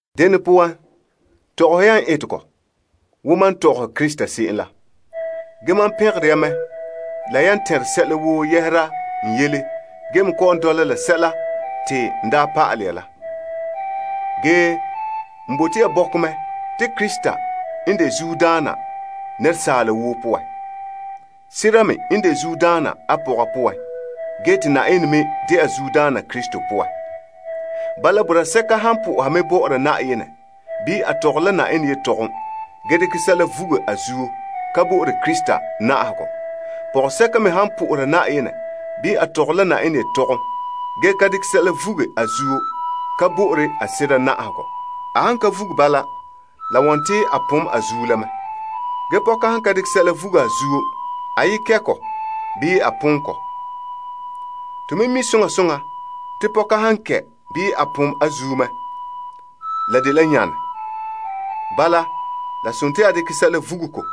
Dene poan, tɔgɔhe ya n etegɔ wo mam tɔgɔhe Krista se'em la. Ge mam pɛngere ya mɛ zo'e zo'e la yan tɛnre sɛla woo yɛhera n yele gee me kɔ'ɔn dɔla la sɛla nɔɔ te n daa pa'alɛ ya la. Ge, n bote ya bɔkɛ mɛ te Krista n de zuodaana nɛresaala woo poan. Sera me n de zuodaana a pɔga poan, gee te Na'ayenɛ me de'a zuodaana Krista poan. Bala, boraa sɛka han po'oha mɛ bɔ'ɔra Na'ayenɛ bii a tɔgɔre la Na'ayenɛ yetɔgom, gee dekɛ sɛla vuge a zuo ka bo'ore Krista na'ahegɔ. Pɔgɔsɛka me n po'ohere bɔ'ɔra Na'ayenɛ, bii a tɔgɔre la Na'ayenɛ yetɔgom gee ka dekɛ sɛla vuge a zuo, ka bo'ore a sera na'ahegɔ. A han ka vuge bala, la wɔn te a pom a zuo la mɛ. Ge pɔka han ka dekɛ sɛla vuge a zuo, a yi kɛ' kɔ bii a pom kɔ. To me mi' soŋa soŋa te pɔka han kɛ' bii a pom a zuo mɛ, la dela yaane. Bala, la sontii a dekɛ sɛla vuge kɔ.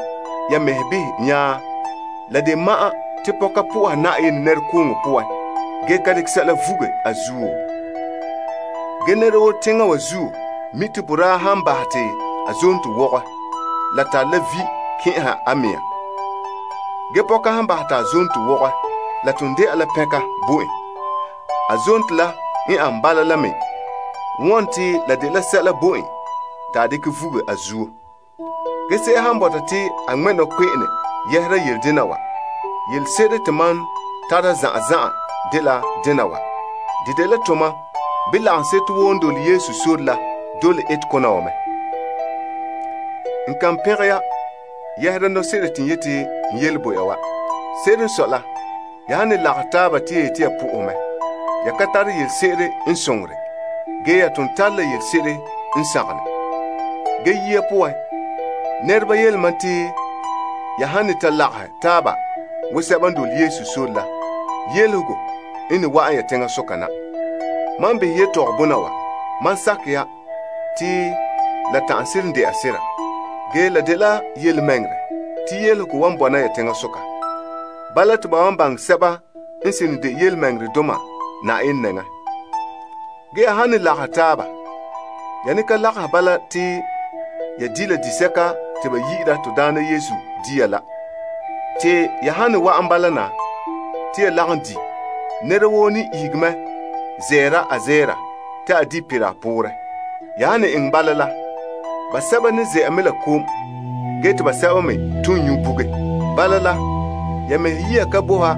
Ya mɛhe tɛn'ɛhe behɛ, te la de ma'an te pɔka soha Yenɛ ge ka dekɛ sɛla vuge a zuo? Nɛra woo teŋa wa zuo mi' te boraa han bahɛ te a zonto wɔgɛ, la tare la vi' kɛn'ɛha a mea. Ge, pɔka han bahɛ te a zonto wɔgɛ, la ton de'a la na'ahegɔ bo en. Se'ere n sɔe la a zonto la n dela sɛla bo en te a pin' a zuo la. Ge, se'em han bɔta te a ŋmɛ' nɔkpe'ene yɛhera yele dena wa, yelese'ere te mam tara zan'an zan'an dela dena wa. De dela tomam, bii lagaŋseto woo n dole Yesu sore la dole etekona wa mɛ. N kan pɛngɛ ya yɛhera nɔse'ere te n yeti n yele bo ya wa. Se'ere n sɔe la, ya han ne lagahɛ taaba te ya yete ya po'ohɛ mɛ, ya ka tare yelese'ere n soŋore, ge ya ton tare la yelese'ere n sagom ne. Ge yia poan, nɛreba yele mam te ya han ne ta lagahɛ taaba wo sɛba n dole Yesu sore la, yelehego n ne wa'an ya teŋasoka na. Mam n behɛ yetɔgɔbɔna wa, mam sakɛ ya te la ta'an seren de'a sera. Ge la de yelemɛŋɛrɛ te yelehego wan bɔna ya teŋasoka. Bala, te ba wan baŋɛ sɛba n seren de yelemɛŋɛrɛdoma Na'ayenɛ nɛŋa. Ge ya han ne lagahɛ taaba, ya ne ka lagahɛ bala te ya di' la disɛka te ba yi'ira to Daana Yesu Dia la. Te ya han ne wa'an bala na te ya lagom di', nɛra woo ne ihege mɛ zɛra a zɛra te a di' perɛ a poorɛ. Ya han ne eŋɛ bala la, basɛba ne ze'a mɛ la kom gee te basɛba me ton nyu' buge. Bala la, ya mɛhe yiya ka bo ha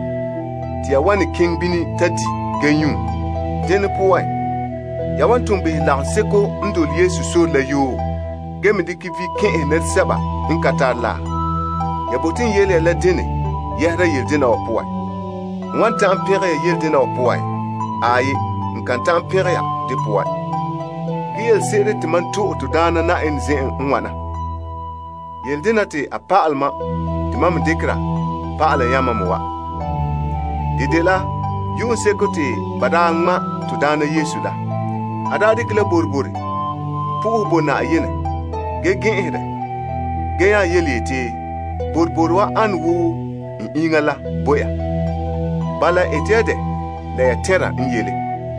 te ya wan ne keŋɛ bini ta di' gee nyu'? Denɛ poan, ya wan ton behɛ lagaŋseko n dole Yesu sore la yoo, gee me dekɛ vi' kɛn'ɛhɛ nɛresɛba n ka tare la? Ya bote n yele ya la dene yɛhera yele dena wa poan? N wan ta'an pɛngɛ ya yele dena wa poan? Aai, n kan ta'an pɛngɛ ya de poan. Ge yelese'ere te mam to'e to Daana zen'en n wana. Yele denɛ te a pa'alɛ mam te mam me dekera pa'alɛ yamam me wa. De dela yu'uŋseko te ba daa ŋma' to Daana Yesu la, a daa dekɛ la boroboro po'ohɛ bo Yenɛ gee gɛn'ɛn dɛ gee nya yeti, Boroboro wa dela n iŋa la bo ya. Bala ete ya dɛ la ya tɛnra n yele.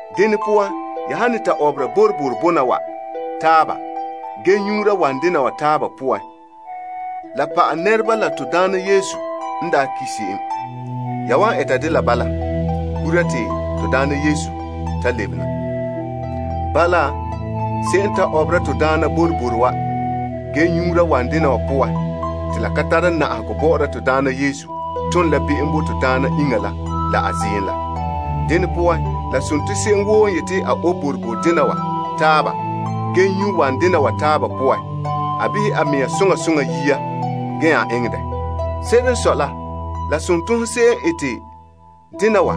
Dene poan ya han ne ta ɔbera boroboro bona wa taaba gee nyuura wanɛ dena wa taaba poan, la pa'alɛ nɛreba to Daana n ki' se'em gura ta lebe na. Bala, se'em n ta ɔbera to Daana boroboro wa gee nyuura wanɛ dena wa poan te la ka tara nare bɔ'ɔra to Daana Yesu, tom la be'em bo to Daana iŋa la la a ziim la. Dene poan, la sontii se'em woo n yete a obe boroboro dena wa taaba gee nyu' wanɛ dena wa taaba poan, a behɛ a mea soŋa soŋa yia gee eŋɛ dɛ. Se'ere n sɔe la, la sontii hon se'em n ete dena wa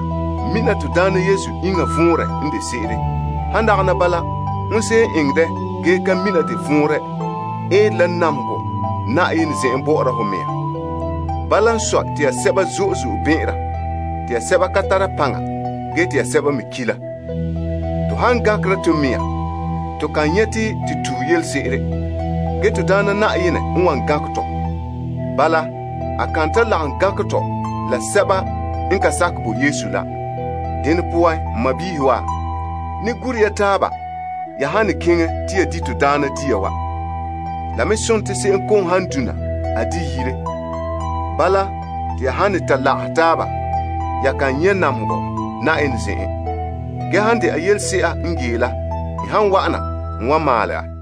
mina to Daana Yesu iŋa vɔnrɛ n de se'ere. Han dagana bala, hon se'em n eŋɛ dɛ gee ka mina de vɔnrɛ eere la namehegɔ zo'e zo'e Na'ayenɛ zen'en bɔ'ɔra ho mea. Bala n sɔe, te ya sɛba zo'e zo'e bɛn'ɛnra, te ya sɛba ka tara paŋa gee te ya sɛba me ki' la. To han gankera to mea, to kan nyɛ' te to tue yelese'ere. Ge, to Daana Na'ayenɛ n wan gankɛ tɔ. Bala, a kan ta lagom gankɛ tɔ la sɛba n ka sakɛ bo Yesu la. Dene poan, n sɔɔnrɔ wa, ne gure ya taaba ya han ne keŋɛ te ya di to Daana dia wa. La me sontii se'em kom han dona, a di' yire. Bala, te ya han ne ta lagahɛ taaba, ya kan nyɛ' namehegɔ Na'ayenɛ zen'en. Ge han de'a yelese'a n gee la, n han wa'ana, n wan maalɛ a.